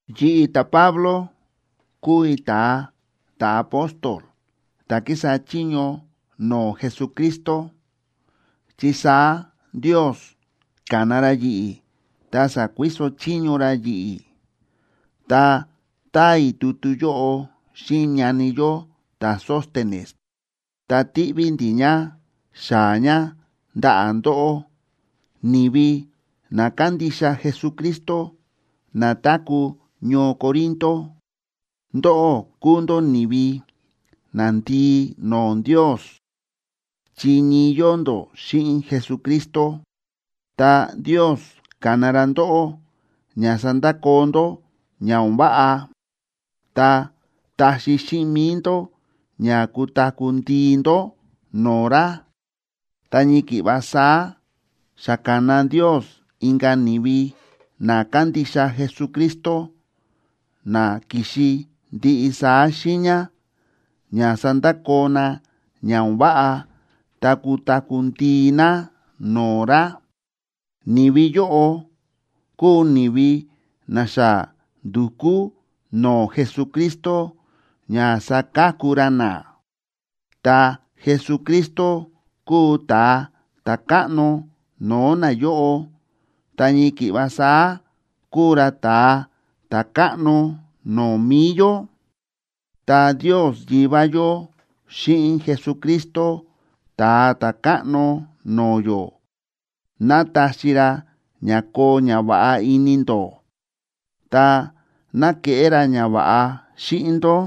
Yi̱ꞌi̱, ta̱Pablo, kúu i̱ ta̱a ta̱apóstol ta̱ kísa chiño no̱o̱ Jesucristo, chi saá Ndios ka̱na ra yi̱ꞌi̱ ta sa̱kuiso chiño ra yi̱ꞌi̱. Ta táa i̱ tutu yóꞌo xíꞌin ñani yó ta̱Sóstenes, ta tíꞌví ndi̱ ña xaa̱ ña ndaꞌa̱ ndóꞌó, ni̱vi na kándixa Jesucristo na táku̱ ñoo Corinto. Ndóꞌó kúu ndó ni̱vi nandii no̱o̱ Ndios chi ñii yóo ndó xíꞌin Jesucristo, ta Ndios ka̱na ra ndóꞌó ña sandakoo ndó ña o̱n váꞌa ta taxi xíꞌin mi̱i ndó ña kutaku̱ ndii ndó no̱o̱ ra. Ta ñii ki̱ꞌva saá xa ka̱na Ndios inka̱ ni̱vi na kándixa Jesucristo, na ki̱xi ndiꞌi saá xiiña, ña sandakoo na ña o̱n váꞌa ta kutaku̱ ndii na no̱o̱ ra. Ni̱vi yóꞌo kúu ni̱vi na xa ndu̱kú no̱o̱ Jesucristo ña saka̱ku ra na, ta Jesucristo kúu ta̱a ta̱káꞌno no̱o̱ nayóꞌo ta ñii ki̱ꞌva saá kúu ra ta̱a ta̱káꞌno no̱o̱ mi̱i yó. Ta Ndios Yivá yó xíꞌin Jesucristo Ta̱a Ta̱káꞌno no̱o̱ yó, ¡ná taxi ra ña koo ñava̱ꞌa ini ndó! Ta, ¡ná keꞌé ra ñava̱ꞌa xíꞌin ndó!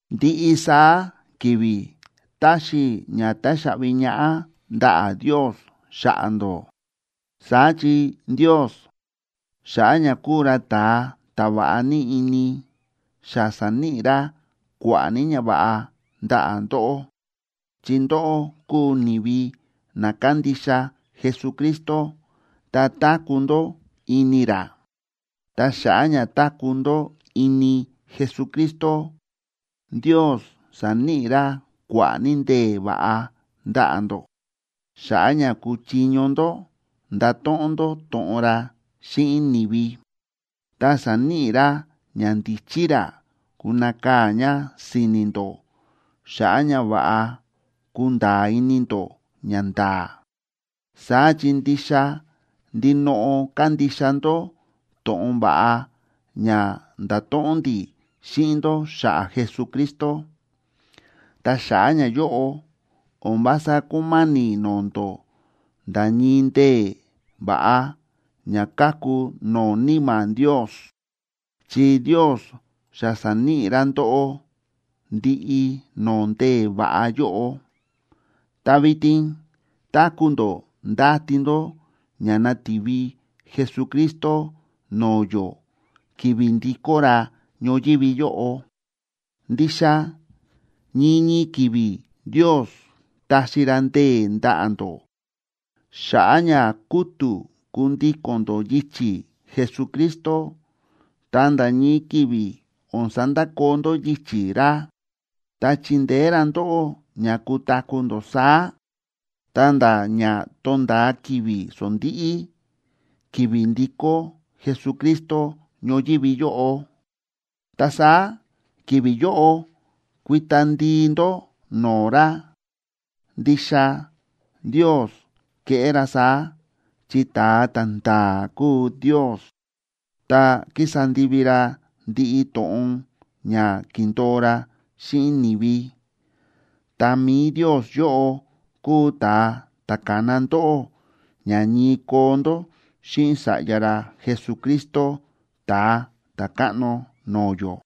Ndiꞌi saá ki̱vi̱ táxi i̱ ña táxaꞌvi ñaꞌá ndaꞌa̱ Ndios xa̱ꞌa̱ ndó. Saá chi Ndios, xa̱ꞌa̱ ña kúu ra ta̱a ta̱ va̱ꞌa ní ini, xa sa̱níꞌi ra kua̱ꞌa̱ ní ñava̱ꞌa ndaꞌa̱ ndóꞌó, chi ndóꞌó kúu ni̱vi na kándixa Jesucristo ta táku̱ ndó ini ra. Ta xa̱ꞌa̱ ña táku̱ ndó ini Jesucristo, Ndios sa̱níꞌi ra kua̱ꞌa̱ ní ndee̱ va̱ꞌa ndaꞌa̱ ndó xa̱ꞌa̱ ña kuchiño ndó ndato̱ꞌon ndó to̱ꞌon ra xíꞌin ni̱vi, ta sa̱níꞌi ra ñandíchí ra kunakaa̱ ña si̱ni̱ ndó xa̱ꞌa̱ ña va̱ꞌa kunda̱a̱ ini ndó ñanda̱a̱. Saá chi ndixa ndinoꞌo kándixa ndó to̱ꞌon va̱ꞌa ña nda̱to̱ꞌon ndi̱ xíꞌin ndó xa̱ꞌa̱ Jesucristo. Ta xa̱ꞌa̱ ñayóꞌo, o̱n vása kúma̱ni̱ no̱o̱ ndó nda̱ ñii ndee̱ va̱ꞌa ña káku no̱o̱ Níma̱ Ndios, chi Ndios xa sa̱níꞌi ra ndóꞌó ndiꞌi no̱o̱ ndee̱ va̱ꞌa yóꞌo. Ta vitin táku̱ ndó ndáti ndó ña nativi Jesucristo no̱o̱ yó ki̱vi̱ ndikó ra ñoyívi yóꞌo. Ndixa ñii ñii ki̱vi̱ Ndios taxi ra ndee̱ ndaꞌa̱ ndó xa̱ꞌa̱ ña kútu̱ kundíko̱n ndó yichi̱ Jesucristo, ta nda̱ ñii ki̱vi̱ o̱n sandakoo ndó yichi̱ ra. Ta chindeé ra ndóꞌó ña kutaku̱ ndó saá, ta̱nda̱ ña tonda̱a ki̱vi̱ sondíꞌí, ki̱vi̱ ndikó Jesucristo ñoyívi yóꞌo. Ta saá ki̱vi̱ yóꞌo kuita ndii ndó no̱o̱ ra. Ndixa Ndios keꞌé ra saá, chi ta̱a ta̱nda̱a̱ kúu Ndios, ta kísa ndivi ra ndiꞌi to̱ꞌon ña ki̱ndo̱o ra xíꞌin ni̱vi. Ta mi̱i Ndios yóꞌo kúu ta̱a ta̱ ka̱na ndóꞌó ña ñii koo ndó xíꞌin Sa̱ꞌya ra Jesucristo Ta̱a Ta̱káꞌno no̱o̱ yó.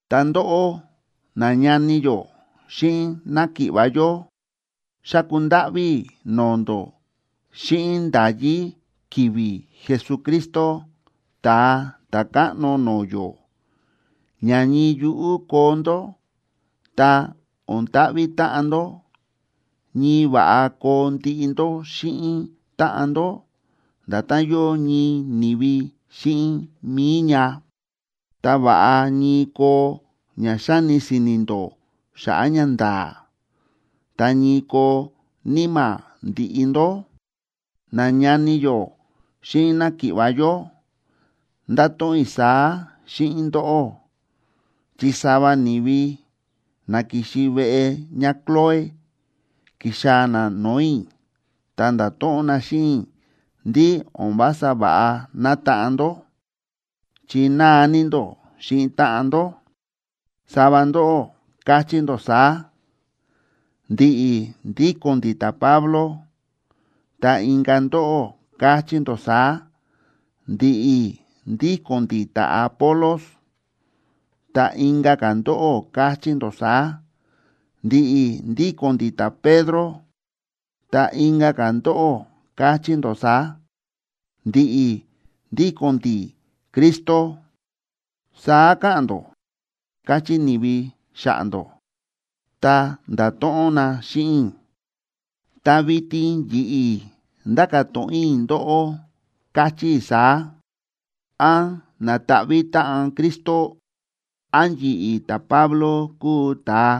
Ta ndóꞌó, nañani yó xíꞌin náki̱ꞌva̱ yó, xáku ndáꞌví i̱ no̱o̱ ndó xíꞌin nda̱yí ki̱vi̱ Jesucristo, Ta̱a Ta̱káꞌno no̱o̱ yó, ña ñii yuꞌú koo ndó ta o̱n ta̱ꞌvi̱ táꞌan ndó. Ñii va̱ꞌa koo ndiꞌi ndó xíꞌin táꞌan ndó, nda̱tán yóo ñii ni̱vi xíꞌin mi̱i ña. Ta va̱ꞌa ñii koo ña xáni si̱ni̱ ndó xa̱ꞌa̱ ñanda̱a̱, ta ñii koo níma̱ ndiꞌi ndó. Nañani yó xíꞌin náki̱ꞌva̱ yó, ndáto̱ꞌon i̱ saá xíꞌin ndóꞌó, chi sava ni̱vi na ki̱xi veꞌe ñáCloé, ki̱xaa̱ na no̱o̱ i̱, ta nda̱to̱ꞌon na xíꞌin i̱ ndí o̱n vása va̱ꞌa nátaꞌan ndó, chi náa ní ndó xíꞌin táꞌan ndó. Sava ndóꞌó káchí ndó saá: “Ndi̱ꞌi̱ ndíko̱n ndi̱ ta̱Pablo.” Ta inka̱ ndóꞌó káchí ndó saá: “Ndi̱ꞌi̱ ndíko̱n ndi̱ ta̱Apolos”, ta inka̱ ka̱ ndóꞌó káchí ndó saá: “Ndi̱ꞌi̱ ndíko̱n ndi̱ ta̱Pedro”, ta inka̱ ka̱ ndóꞌó káchí ndó saá: “Ndi̱ꞌi̱ ndíko̱n ndi̱ Cristo.”a Saá káꞌa̱n ndó, káchí ni̱vi xa̱ꞌa̱ ndó ta nda̱to̱ꞌon na xíꞌin i̱. Ta vitin yi̱ꞌi̱ ndáka̱ to̱ꞌon i̱ ndóꞌó, káchí i̱ saá: ¿Án na̱taꞌví táꞌan Cristo? ¿Án yi̱ꞌi̱ ta̱Pablo kúu ta̱a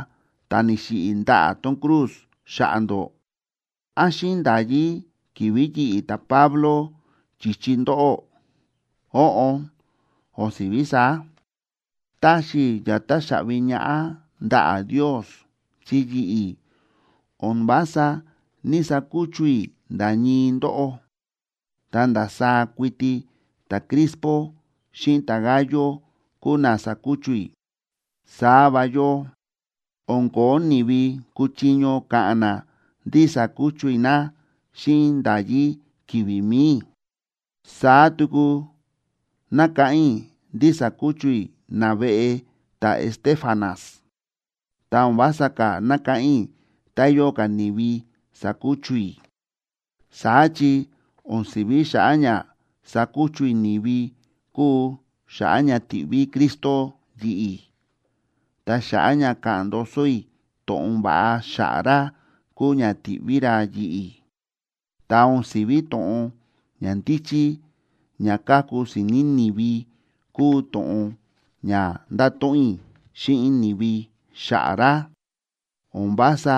ta̱ ni̱xiꞌi̱ ndaꞌa̱ tón cruz xa̱ꞌa̱ ndó? ¿Án xíꞌin nda̱yí ki̱vi̱ yi̱ꞌi̱ ta̱Pablo chi̱chi ndóꞌó? Óꞌon, o̱n si̱ví saá. Táxi i̱ ña táxaꞌvi ñaꞌá ndaꞌa̱ Ndios chi yi̱ꞌi̱ o̱n vása ní‑sakuchu i̱ nda̱ ñii ndóꞌó, ta ndasaá kuiti ta̱Crispo xíꞌin ta̱Gayo kúu na sa̱kuchu i̱. Saá va yóo, o̱n ko̱ó ni̱vi kúchiño ka̱ꞌa̱n na ndí sa̱kuchu i̱ na xíꞌin nda̱yí ki̱vi̱ mi̱i i̱. Saá tuku nákáꞌán i̱ ndí sa̱kuchu i̱ naveꞌe ta̱Estéfanas, ta o̱n vása ka̱ nákáꞌán i̱ tá yóo ka̱ ni̱vi sa̱kuchu i̱. Saá chi o̱n si̱ví xa̱ꞌa̱ ña sakuchu i̱ ni̱vi kúu xa̱ꞌa̱ ña ti̱ꞌví Cristo yi̱ꞌi̱, ta xa̱ꞌa̱ ña ka̱ꞌa̱n ndoso i̱ to̱ꞌon va̱ꞌa xa̱ꞌa̱ ra kúu ña ti̱ꞌví ra yi̱ꞌi̱. Ta o̱n si̱ví to̱ꞌon ña ndíchí ña káku si̱ni̱ ni̱vi kúu to̱ꞌon ña ndáto̱ꞌon i̱ xíꞌin ni̱vi xa̱ꞌa̱ ra. O̱n vása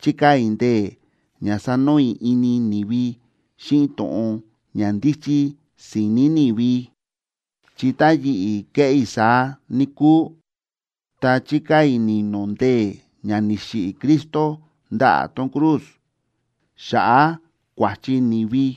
chíkaa̱ i̱ ndee̱ ña sanoo i̱ ini ni̱vi xíꞌin to̱ꞌon ña ndíchí si̱ni̱ ni̱vi, chi tá yi̱ꞌi̱ keꞌé i̱ saá, níkúu, ta chikaa̱ i̱ ni̱no̱ ndee̱ ña ni̱xiꞌi̱ Cristo ndaꞌa̱ tón cruz xa̱ꞌa̱ kua̱chi ni̱vi.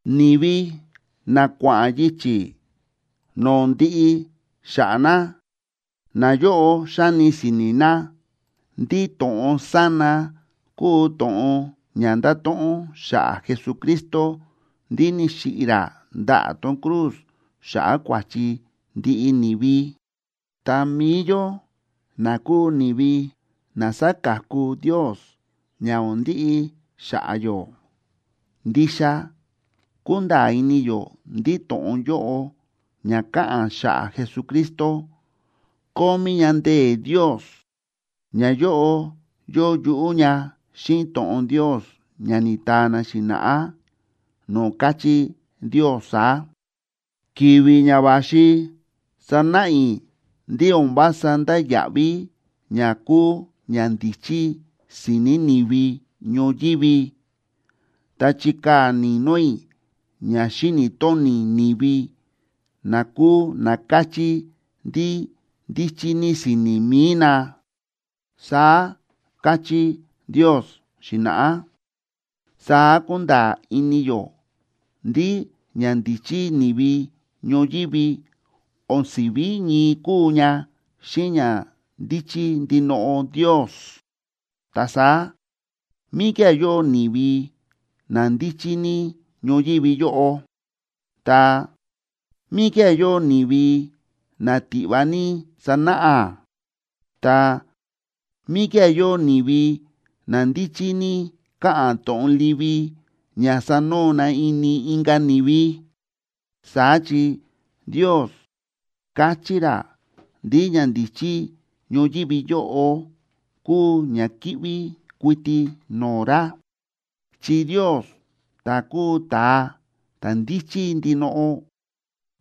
Ni̱vi na kua̱ꞌa̱n yichi̱ no̱o̱ ndiꞌi xa̱ꞌa̱ na, nayóꞌo xáni si̱ni̱ na ndí to̱ꞌon sána kúu to̱ꞌon ña ndáto̱ꞌon xa̱ꞌa̱ Jesucristo ndí ni̱xiꞌi̱ ra ndaꞌa̱ tón cruz xa̱ꞌa̱ kua̱chi ndiꞌi ni̱vi. Ta mi̱i yó, na kúu ni̱vi na sáka̱ku Ndios ña o̱n ndiꞌi xa̱ꞌa̱ yó, ndixa kúnda̱a̱ ini yó ndí to̱ꞌon yóꞌo ña káꞌa̱n xa̱ꞌa̱ Jesucristo, kómí ña ndee̱ Ndios. Ñayóꞌo yóo yuꞌú ña xíꞌin to̱ꞌon Ndios ña ni̱taa na xi̱na̱ꞌá no̱o̱ káchí Ndios saá: Ki̱vi̱ ña va̱xi, sanáꞌa i̱ ndí o̱n vása ndáya̱ꞌví ña kúu ñandíchí si̱ni̱ ni̱vi ñoyívi. Ta chikaa̱ ni̱no̱ i̱ ña xíni̱ tóni ni̱vi na kúu na káchí ndí ndíchí ní si̱ni̱ mi̱i na, saá káchí Ndios xi̱na̱ꞌá. Saá kúnda̱a̱ ini yó ndí ñandíchí ni̱vi ñoyívi o̱n si̱ví ñii kúu ña xíꞌin ñandíchí ndinoꞌo Ndios. Ta saá, ¿míkía̱ yóo ni̱vi na ndíchí ní ñoyívi yóꞌo?, ta, ¿míkía̱ yóo ni̱vi na tiꞌva ní sánáꞌa?, ta, ¿míkía̱ yóo ni̱vi na ndíchí ní káꞌa̱n to̱ꞌon livi ña sanoo na ini inka̱ ni̱vi? Saá chi Ndios káchí ra ndí ñandíchí ñoyívi yóꞌo kúu ñakíꞌví kuiti no̱o̱ ra. Chi Ndios, ta̱ kúu ta̱a ta̱ ndíchí ndinoꞌo,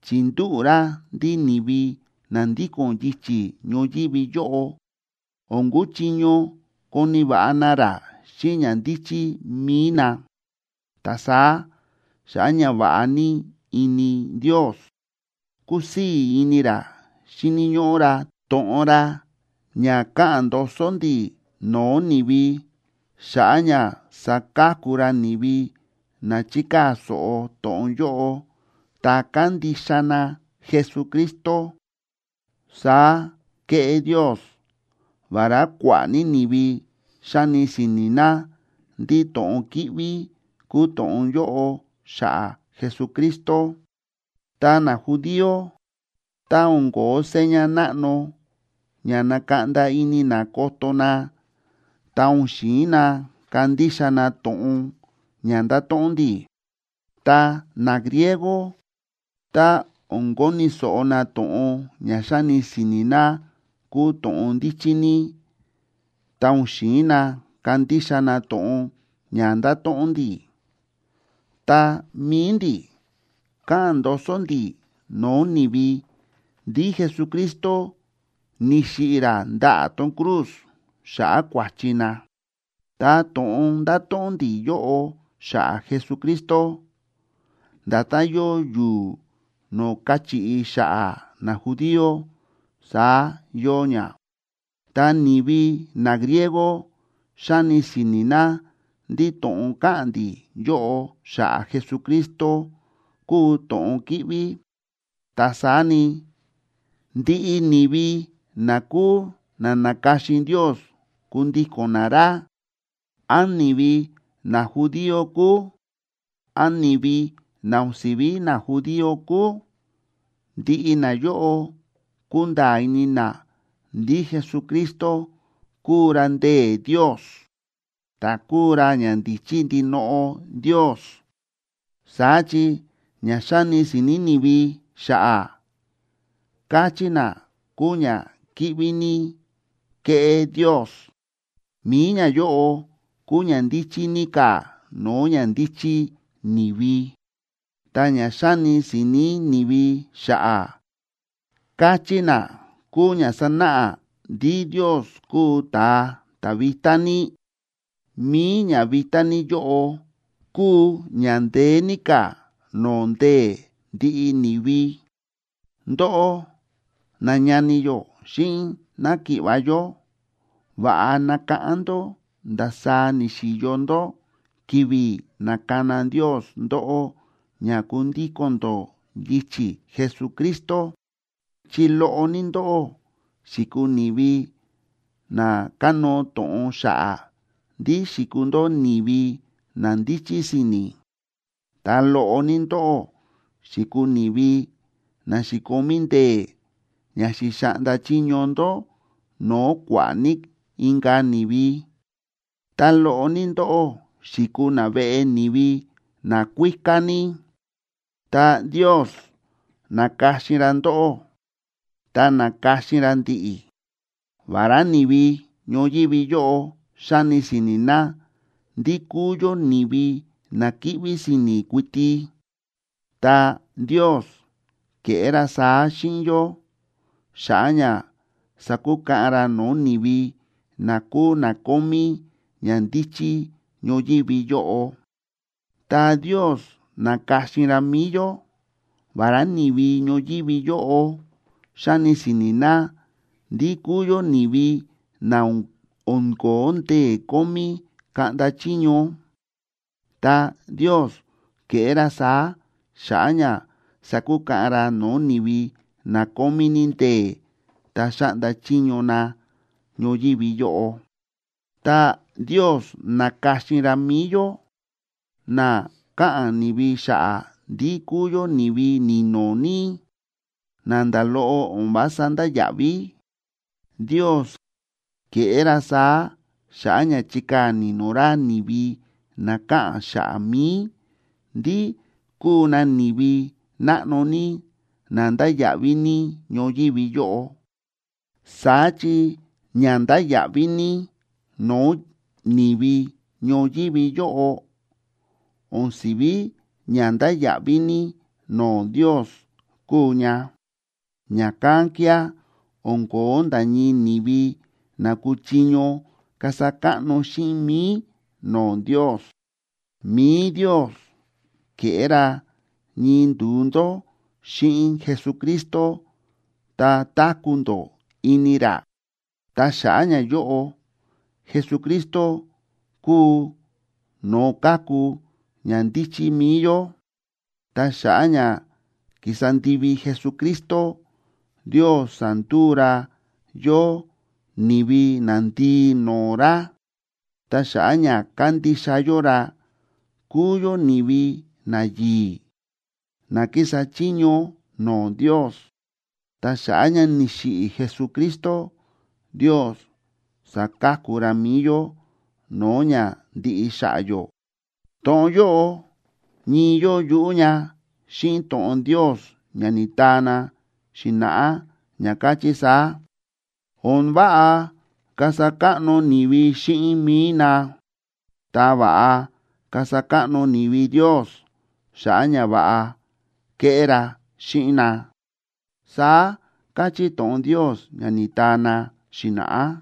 chi̱ndúꞌu̱ ra ndí ni̱vi na ndíko̱n yichi̱ ñoyívi yóꞌo o̱n kuchiño koni̱ va̱ꞌa na ra xíꞌin ñandíchí mi̱i na. Ta saá xa̱ꞌa̱ ñava̱ꞌa ní ini Ndios, kúsii̱ ini ra xíni̱ ñóꞌó ra to̱ꞌon ra ña káꞌa̱n ndoso ndi̱ no̱o̱ ni̱vi, xa̱ꞌa̱ ña saka̱ku ra ni̱vi na chíkaa̱ so̱ꞌo to̱ꞌon yóꞌo ta kándixa na Jesucristo. Saá kéꞌé Ndios, vará kua̱ꞌa̱ ní ni̱vi xáni si̱ni̱ na ndí to̱ꞌon kíꞌví kúu to̱ꞌon yóꞌo xa̱ꞌa̱ Jesucristo. Ta najudío, tá o̱n ko̱ó seña náꞌno ña nakaꞌnda ini na koto na, ta o̱n xi̱in na kandixa na to̱ꞌon ña ndáto̱ꞌon ndi̱. Ta nagriego, tá o̱n koni̱ so̱ꞌo na to̱ꞌon ña xáni si̱ni̱ na kúu to̱ꞌon ndíchí ní, ta o̱n xi̱in na kandixa na to̱ꞌon ña ndáto̱ꞌon ndi̱. Ta mi̱i ndi̱, káꞌa̱n ndoso ndi̱ no̱o̱ ni̱vi ndí Jesucristo ni̱xiꞌi̱ ra ndaꞌa̱ tón cruz xa̱ꞌa̱ kua̱chi na. Ta to̱ꞌon ndáto̱ꞌon ndi̱ yóꞌo xa̱ꞌa̱ Jesucristo, nda̱tán yóo yu̱u̱ no̱o̱ káchiꞌi xa̱ꞌa̱ najudío, saá yóo ña. Ta ni̱vi nagriego xáni si̱ni̱ na ndí to̱ꞌon káꞌa̱n ndi̱ yóꞌo xa̱ꞌa̱ Jesucristo kúu to̱ꞌon kíꞌví. Ta saá ni, ndiꞌi ni̱vi na kúu na na̱ka̱xin Ndios kundíko̱n na ra, án ni̱vi najudío kúu, án ni̱vi na o̱n si̱ví najudío kúu, ndiꞌi nayóꞌo kúnda̱a̱ ini na ndí Jesucristo kúu ra ndee̱ Ndios, ta kúu ra ñandíchí ndinoꞌo Ndios. Saá chi ña xáni si̱ni̱ ni̱vi xa̱ꞌa̱, káchí na kúu ñakíꞌví ní kéꞌé Ndios, mi̱i ñayóꞌo kúu ña ndíchí ní ka̱ no̱o̱ ñandíchí ni̱vi. Ta ña xáni si̱ni̱ ni̱vi xa̱ꞌa̱, káchí na kúu ña sánáꞌa ndí Ndios kúu ta̱a ta̱ vitá ní, mi̱i ñavitá ní yóꞌo kúu ña ndeé ní ka̱ no̱o̱ ndee̱ ndiꞌi ni̱vi. Ndóꞌó nañani yó xíꞌin náki̱ꞌva̱ yó, va̱ꞌa nakáꞌán ndó ndasaá ni̱xi̱yo ndó ki̱vi̱ na̱kana Ndios ndóꞌó ña kundíko̱n ndó yichi̱ Jesucristo, chi loꞌo ní ndóꞌó xi̱kuu ni̱vi na kánóo to̱ꞌon xa̱ꞌa̱ ndí xi̱kuu ndó ni̱vi na ndíchí si̱ni̱. Ta loꞌo ní ndóꞌó xi̱kuu ni̱vi na xi̱komí ndee̱ ña xi̱xaꞌnda chiño ndó no̱o̱ kua̱ꞌa̱ ní inka̱ ni̱vi, ta loꞌo ní ndóꞌó xi̱kuu naveꞌe ni̱vi nakuíká ní. Ta Ndios na̱ka̱xin ra ndóꞌó ta na̱ka̱xin ra ndi̱ꞌi̱, vará ni̱vi ñoyívi yóꞌo xáni si̱ni̱ na ndí kúu yó ni̱vi na kíꞌví si̱ni̱ kuiti. Ta Ndios ke̱ꞌé ra saá xíꞌin yó xa̱ꞌa̱ ña sakukaꞌan ra no̱o̱ ni̱vi na kúu na kómí ñandíchí ñoyívi yóꞌo. Ta Ndios na̱ka̱xin ra mi̱i yó, vará ni̱vi ñoyívi yóꞌo xáni si̱ni̱ na ndí kúu yó ni̱vi na o̱n ko̱ó ndee̱ kómí kaꞌnda chiño. Ta Ndios ke̱ꞌé ra saá xa̱ꞌa̱ ña sakukaꞌan ra no̱o̱ ni̱vi na kómí ní ndee̱ ta xáꞌnda chiño na ñoyívi yóꞌo. Ta Ndios na̱ka̱xin ra mi̱i yó, na káꞌa̱n ni̱vi xa̱ꞌa̱ ndí kúu yó ni̱vi ni̱no̱ ní, na nda̱ loꞌo o̱n vása ndáya̱ꞌví. Ndios ke̱ꞌé ra saá xa̱ꞌa̱ ña chikaa̱ ni̱no̱ ra ni̱vi na káꞌa̱n xa̱ꞌa̱ mi̱i, ndí kúu na ni̱vi náꞌno ní na ndáya̱ꞌví ní ñoyívi yóꞌo. Saá chi ña ndáya̱ꞌví ní no̱o̱ ni̱vi ñoyívi yóꞌo, o̱n si̱ví ña ndáya̱ꞌví ní no̱o̱ Ndios kúu ña. Ña̱kán kía̱ o̱n ko̱ó nda̱ ñii ni̱vi na kúchiño kasa káꞌno xíꞌin mi̱i no̱o̱ Ndios. Mi̱i Ndios ke̱ꞌé ra ñii ndu̱u ndó xíꞌin Jesucristo ta táku̱ ndó ini ra. Ta xa̱ꞌa̱ ñayóꞌo, Jesucristo kúu no̱o̱ káku ñandíchí mi̱i yó. Ta xa̱ꞌa̱ ña ki̱sa ndivi Jesucristo, Ndios sa̱nduu ra yó ni̱vi nandii no̱o̱ ra. Ta xa̱ꞌa̱ ña kándixa yó ra kúu yó ni̱vi nayi̱i̱, na kísa chiño no̱o̱ Ndios. Ta xa̱ꞌa̱ ña ni̱xiꞌi̱ Jesucristo, Ndios sa̱ka̱ku ra mi̱i yó no̱o̱ ña ndiꞌi xa̱ꞌa̱ yó. To̱ꞌon yóꞌo ñii yóo yuꞌú ña xíꞌin to̱ꞌon Ndios ña ni̱taa na xi̱na̱ꞌá, ña káchí saá: “O̱n váꞌa kasa káꞌno ni̱vi xíꞌin mi̱i na. Ta va̱ꞌa kasa káꞌno ni̱vi Ndios xa̱ꞌa̱ ñava̱ꞌa kéꞌé ra xíꞌin na”, saá káchí to̱ꞌon Ndios ña ni̱taa na xi̱na̱ꞌá.